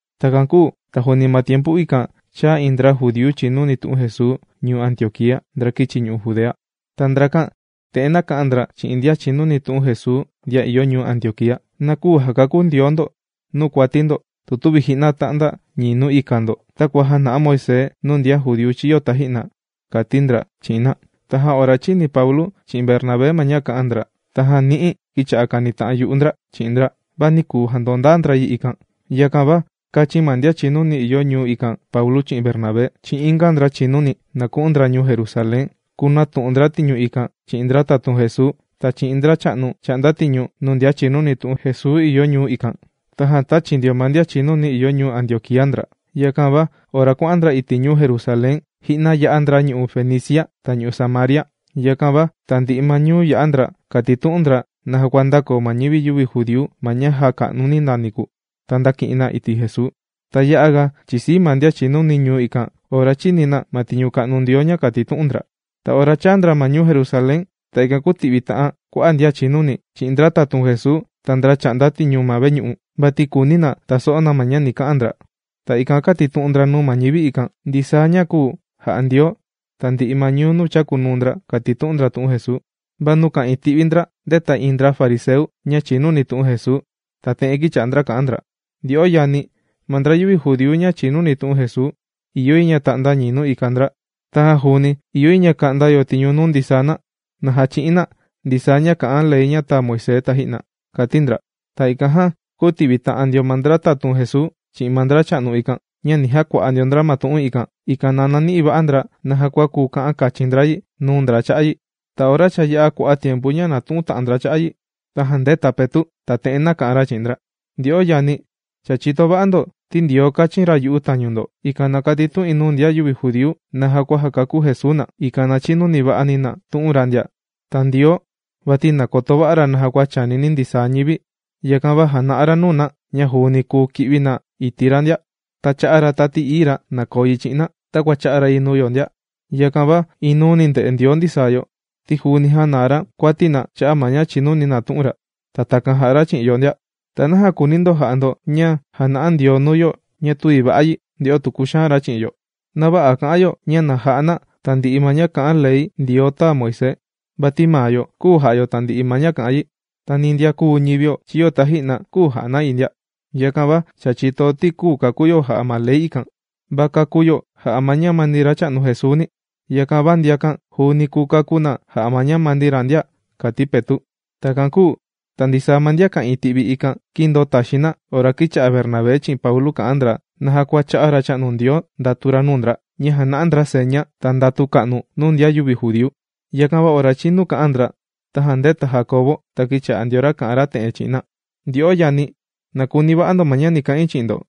Takan kūu ta juuni ma tiempu ikan chāa iin ndra judíu chìnuni tu'un Jesuu ñuu Antioquía, ndra kīchi ñu'u' Judea. Ta ndrakan te'en nāka'an ndra chi'in ndian chìnuni tu'un Jesuu ndian ìyo ñuu Antioquía: “Na küu jakakú Ndioo ndo nuu kuati ndo, tu tüvi ji'na tà'nda ñii nuu ika ndo takua jāna'a Moisés nuu ndian judíu chīyo taji'na”, kàti ndra chi'in na. Tajan ora chīni Paulu chi'in Bernabé ma ña kā'an ndra tajan ni'i kīcha'a ndra kànita'an yu'u ndra chi'in ndra, va nī kuu jandondaa ndra yi ikan. Yakan va kāchin ma ndian chìnuni ìyo ma ñuu ikan, Paulu chi'in Bernabé chi'in inga ndra chìnuni, na ku'un ndra ñuu Jerusalén kunatu'un ndra tiñu ikan chi'in ndra tatun Jesuu, ta chi'in ndracha'nu chà'nda tiñu nuu ndian chìnuni tu'un Jesuu ìyo ñuu ikan. Tajan tāchi ndio ma ndian chìnuni ìyo ñuu Antioquía ndra. Yakan va ora kuà'an ndra iti' ñuu Jerusalén, ji'na yā'a ndra ñu'u' Fenicia ta ñu'u' Samaria. Yakan va tandi'i ma ñuu yà'a ndra kàtitu'un ndra naja kua ndàkoo ma ñivi yüvi judíu ma ña jāka'nu na niku, ta ndāki'in na iti' Jesuu. Ta ya'a ga chìsii ma ndian chìnuni ñuu ikan ora chīni na ma tiñu ka'nu Ndioo ña kàtitu'un ndra. Ta ora chāa ndra ma ñuu Jerusalén ta ikan kūti'vita'an kua'a' ma ndian chìnuni chi'in ndra tatun Jesuu ta ndracha'nu chà'nda tiñu ma veñu'u. Vati kùuni na taso'o na ma ña ni ka'an ndra. Ta ikan kātitu'un ndra nuu ma ñivi ikan ndisaa ña kūu ja'a Ndioo tandi'i ma ñuu nuu chākunuu ndra kàtitu'un ndra tu'un Jesuu. Va nuu ka'ìin ti'vi ndra, ndēta iin ndra fariseu ña chìnuni tu'un Jesuu, ta te'en kīcha'a ndra kà'an ndra: ―Ndyo'o yani, ma ndra yüvi judíu ña chìnuni tu'un Jesuu, ìyo yi ña ta'nda ñii nuu ika ndra. Tajan juuni ìyo yi ña ka'nda yo tiñu nuu ndisaa na, na jachi'in na ndisaa ña kà'an ma ley tāa Moisés taji'na ―kàti ndra. Ta ikan jan, kūti'vi ta'an ndio ma ndra tatun Jesuu chi'in ma ndracha'nu ikan ña ni jakua'a ndio ndra ma tu'un ikan, ikan na nani'i va'a ndra naja kua kuu ka'an kachin ndra yi nuu ndra cha'a' yi. Ta ora cha ya'a kua'a' tiempu ña nàtu'un ta'an ndra cha'a' yi, tajan ndēta Petu' ta te'en nāka'an ra chi'in ndra: ―Ndyo'o yani̱, cha chìto va'a ndo, ti Ndioo kāchin ra yu'u tañu ndo, ikan na katitu'in nuu ndian yüvi judíu naja kua jakakú Jesuu na, ikan na chinuva'ani na tu'un ra ndia. Ta Ndioo vati nàkoto va'a ra naja kua chànini ndisaa ñivi, yakan va jàna'a ra nuu na ña juuni kùu ki'vi na iti' ra ndia. Ta chā'a ra Tati Ií ra ña na koo yi chi'in na takua chā'a ra yi nuu yo ndia. Yakan va inuu ndè'e Ndioo ndisaa yo, ti juuni jānaa ra kuati na cha'a' ma ña chìnuni na tu'un ra, ta takan jà'a ra chi'in yo ndia. Ta naja kùuni ndo ja'a ndo ña jàna'a Ndioo nuu yo ña tüvi va'a yi, nde'o tu kuxaan ra chi'o. Na vä'a kà'an yo ña na ja'a na tandi'i ma ña kà'an Ley Ndioo tāa Moisés. Vati ni maa yo küu ja'a yo tandi'i ma ña kà'an yi. Ta ni ndian kūu ñivio chiyo taji'na küu ja'a na yi ndia. Yakan va chìto yo, ti küu kakú yo jà'a ma ley ikan, va kàkú yo jà'a ma ñamani Racha'nu Jesuuni. Yakan va ndiakan juuni kùu kakú na jà'a ma ñamani ra ndia ―kàti Petu'. Takan kūu ta ndisaa ma ndian ka'ìin ti'vi ma ikan, kīndoo taxiin na ora kīcha'a Bernabé chi'in Paulu kà'an ndra naja kua chā'a Racha'nu Ndioo ndatu ra nuu ndra ña jàna'a ndra seña ta ndatu ka'nu nuu ndian yüvi judíu. Yakan va ora chīnu kà'an ndra, tajan ndēta Jandiau ta kīcha'a ndio ra kà'an ra te'en chi'in na: ―Ndyo'o yani̱, na kuni va'a ndo ña ni ka'in chi'in ndo: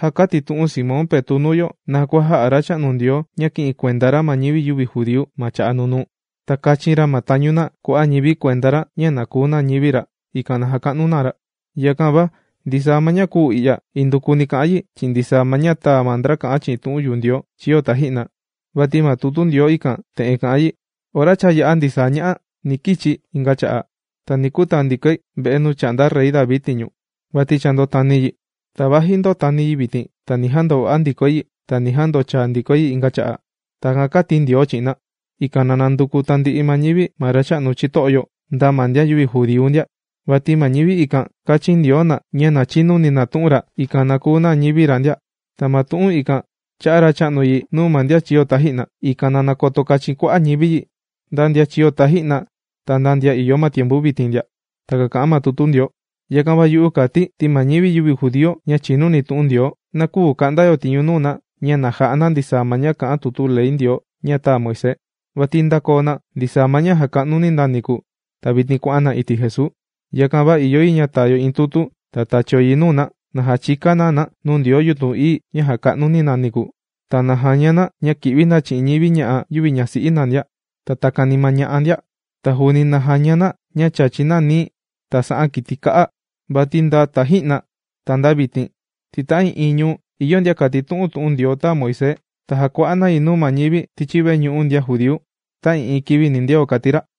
Já kātitu'un Simón Petu' nuu yo naja kua jā'a Racha'nu Ndioo ña kī'in kuenda ra ma ñivi yüvi judíu ma cha'a' nunuu, ta kāchin ra ma tañu na kua'a' ñivi kuenda ra ña na kuu na ñivi ra, ikan na jaka'nu na ra. Yakan va ndisaa ma ña kùu i'ya, indukuni kà'an yi chi'in ndisaa ma ña tāa ma ndra kà'an chi'in tu'un yu'u Ndioo chīyo taji'na, vati ma tutu Ndioo ikan te'en kà'an yi: Ora cha yā'a ndisaa ña'a, ni kichi̱ inga cha'a'. Ta ni kutaa ndikoi ve'e nuu chà'nda Rey David tiñu vati cha ndōtani yi. Ta vaji ndòtani yi vitin, ta ni jandova'a ndikoi yi ta ni jandochai yi inga cha'a'. Takan kāti Ndioo chi'in na, ikan na nanduku tandi'i ma ñivi ma Racha'nu chito'o yo, nda ma ndian yüvi judíu ndia. Vati ma ñivi ikan, kāchin Ndioo na ña na chinuni na tu'un ra, ikan na kuu na ñivi ra ndia. Ta ma tu'un ikan chā'a ma Racha'nu yi nuu ma ndian chīyo taji'na, ikan na nakoto kachin kua'a' ñivi yi nda ndian chīyo taji'na, ta nda ndian ìyo ma tiempu vitin ndia. Takan kà'an ma tutu Ndioo. ’Yakan va yu'u, kàti̱ ti ma ñivi yüvi judíu ña chìnuni tu'un Ndioo na küu ka'nda yo tiñu nuu na ña na ja'a na ndisaa ma ña kà'an tutu ley Ndioo ña tāa Moisés. Vati cha ndākoo na ndisaa ma ña jàka'nu na niku, ta vitin kuà'an na iti' Jesuu. Yakan va ìyo yi ña taa yo iin tutu, ta tachio yi nuu na, na jachika na na nuu ndioo yutun ií ña jàka'nu na niku, ta na jaña na ña kì'vi na chi'in ña'a' yüvi ñasi'i na ndia, ta takani ma ña'a ndia. Ta juuni na jaña na ña chàchi na nií ta sa'an kiti kā'a. Vati nda taji'na ta nda vitin, ti ta'ii'iin ñuu ìyo ndian kàtitu'un tu'un Ndioo tāa Moisés. Ta jàkua'a na yi nuu ma ñivi tichi veñu'u ndian judíu ta'ii'iin kivi nindeo ―kàti ra.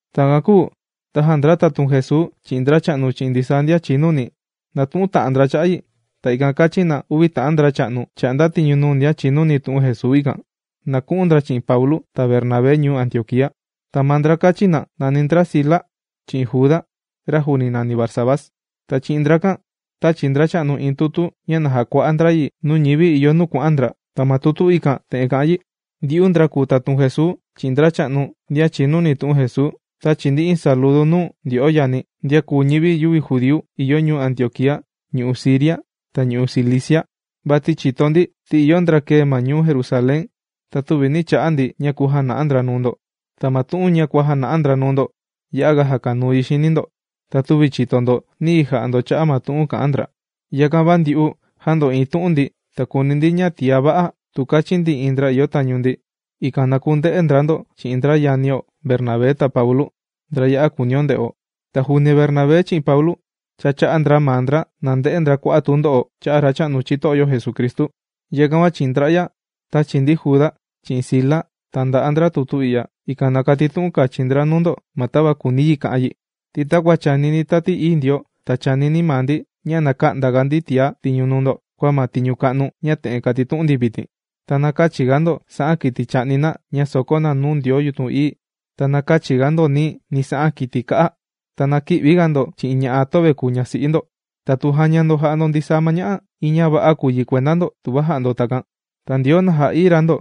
Takan kūu tajan ndra tatun Jesuu chi'in ndracha'nu chi'in ndisaa ndian chìnuni, nātu'un na cha'a' yi ta ikan kāchin na uvi ta'an ndracha'nu, chà'nda tiñu nuu ndian chìnuni tu'un Jesuu ikan, na ku'un ndra chi'in Paulu ta Bernabé ñuu Antioquía. Ta ma ndra kāchin na, nàni ndra Sila chi'in Juda, ra juuni nàni ra Barsabás. Ta chi'in ndrakan tāchi ndracha'nu iin tutu ña na jakua'a ndra yi nuu ñivi ìyo nuu kuà'an ndra. Ta ma tutu ikan, te'en kà'an yi: “Ndyu'u ndra kùu tatun Jesuu, chi'in ndracha'nu ndian chìnuni tu'un Jesuu, tāchi ndi iin saludu nuu ndyo'o yani, ndian kùu ñivi yüvi judíu ìyo ñuu Antioquía, ñu'u' Siria, ta ñu'u' Cilicia. Vati chìto ndi ti ìyo ndra kēe ma ñuu Jerusalén ña tüvi nī cha'a ndi ña kujana'a ndra nuu ndo. Ta ma tu'un kuàjana'a ndra nuu ndo ya'a ga jàkanuu yi xini ndo, ta tüva chìto ndo niyi ja'a ndo cha'a' ma tu'un kà'an ndra. Yakan va ndyu'u jāndo'iin tu'un ndi ta kùuni ndi ña tiá va'a, tu kachin ndi iin ndra ìyo tañu ndi, ikan na kunde'e ndra ndo chi'in ndra yanio Bernabé ta Paulu, ndra ya'a kùunio nde'o. Ta juuni Bernabé chi'in Paulu, cha chā'a ndra maa ndra na nde'e ndra kua'a' tundo'o cha'a' Racha'nu chito'o yo Jesucristu. Yakan va chi'in ndra'ya tāchi ndi Juda chi'in Sila ta nda'a ndra tutu i'ya, ikan na katitu'un kachin ndra nuu ndo ma tava kùuni yi ka'an yi. Ti takua chànini Tati Ií Ndioo, ta chànini maa ndi ña na kä'nda ga ndi tiá tiñu nuu ndo kua ma tiñu ka'nu ña te'en kàtitu'un ndi vitin: Ta na kächi ga ndo sa'an kiti chà'ni na ña sòkó na nuu ndioo yutun ií. Ta na kächi ndo nií, ni sa'an kiti kā'a. Ta na kï'vi ndo chi'in ña'a' töve kùu ñasi'i ndo. Tatu jàña ndo jà'a ndo ndisaa ña'a, iin ña va'a kùu yi kuenda ndo tuva ja'a ndo takan. Ta Ndioo na ja'ií ra ndo”,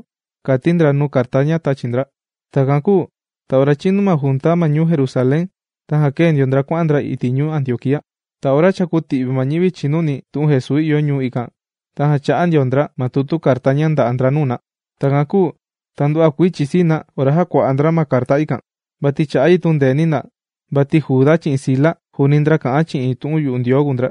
kàti ndra nuu carta ña tàchi ndra. Takan kūu ta ora chīnu ma junta ma ñuu Jerusalén, tajan kēe ndio ndra kuà'an ndra ma ñuu Antioquía. Ta ora cha kūti'vi ma ñivi chìnuni tu'un Jesuu ìyo ñuu ikan, tajan chā'a ndra ma tutu carta ña ndà'a ndra nuu na. Takan kūu ta nduva'a kuii chìsii na, ora jākua'a ndra ma carta ikan. Vati chà'a yi tundeeni na. Vati Juda chi'in Sila juuni ndra kà'an chi'in tu'un yu'u Ndioo kùu ndra,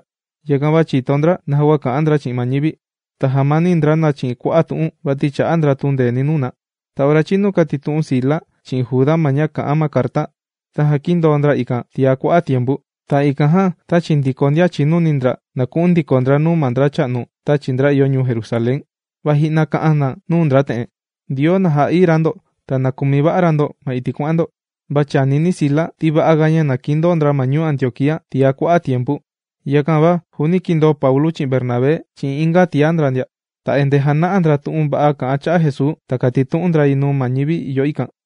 yakan va chìto ndra naja kua kà'an ndra chi'in ma ñivi. Ta jàmani ndra na chi'in kua'a' tu'un, vati chā'a ndra tundeeni nuu na. Ta ora chīnu kàtitu'un Sila chi'in Juda ma ña kà'an ma carta, tajan kīndoo ndra ikan tiá kua'a' tiempu. Ta ikan jan tāchi ndiko ndian chìnuni ndra, na ku'un ndiko ndra nuu ma ndracha'nu tāchi ndra ìyo ñuu Jerusalén. Va ji'na kà'an na nuu ndra te'en: ―Ndioo na jà'ií ra ndo ta na kumi va'a ra ndo ma iti' kuà'an ndo. Va chànini Sila ti va'a ga ña kìndoo ndra ñuu Antioquía tiá ga tiempu. Yakan va juuni kīndoo Paulu chi'in Bernabé chi'in inga tiá ndra ndia. Ta endee jàna'a ndra tu'un va'a kà'an cha'a' Jesuu ta kàtitu'un ndra yi nuu ma ñivi ìyo ikan.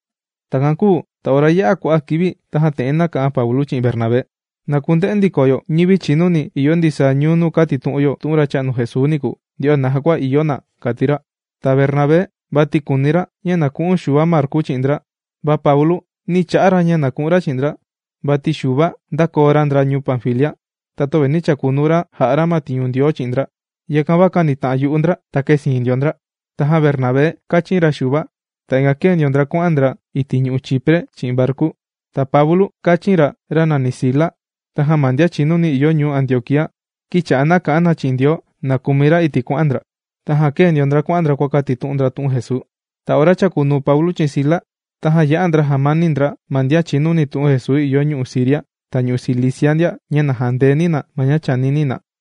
Takan kūu ta ora yā'a kua'a' kivi tajan te'en nāka'an Paulu chi'in Bernabé: ―Na kunde'e ndiko yo ñivi chìnuni ìyo ndisaa ñuu nuu kātitu'un yo tu'un Racha'nu Jesuu niku. Nde'o naja kua ìyo na ―kàti ra. Ta Bernabé, vati kùuni ra ña na ku'un Xuva Marku chi'in ndra, va Paulu nī cha'a ra ña ku'un ra chi'in ndra, vati Xuva ndākoo ra ndra ñuu Panfilia, ta töva nī chakunuu ra jà'a ra ma tiñu Ndioo chi'in ndra. Yakan va kānita'an yu'u ndra, ta kēsiin ndio ndra. Tajan Bernabé kāchin ra Xuva. Ta ikan kēe ndio ndra kuà'an ndra iti' ñu'u' Chipre chi'in varku. Ta Paulu kāchin ra ra nàni Sila. Tajan ma ndian chìnuni ìyo ñuu Antioquía, kīcha'a na kà'an na chi'in Ndioo na kumi ra iti' kuà'an ndra. Tajan kēe ndio ndra kuà'an ndra kuàkatitu'un ndra tu'un Jesuu. Ta ora chàkunuu Paulu chi'in Sila, tajan yā'a ndra jàmani ndra ma ndian chìnuni tu'un Jesuu ìyo ñu'u' Siria ta ñu'u' Cilicia ndia, ña na jandeeni ma ña chìnuni na.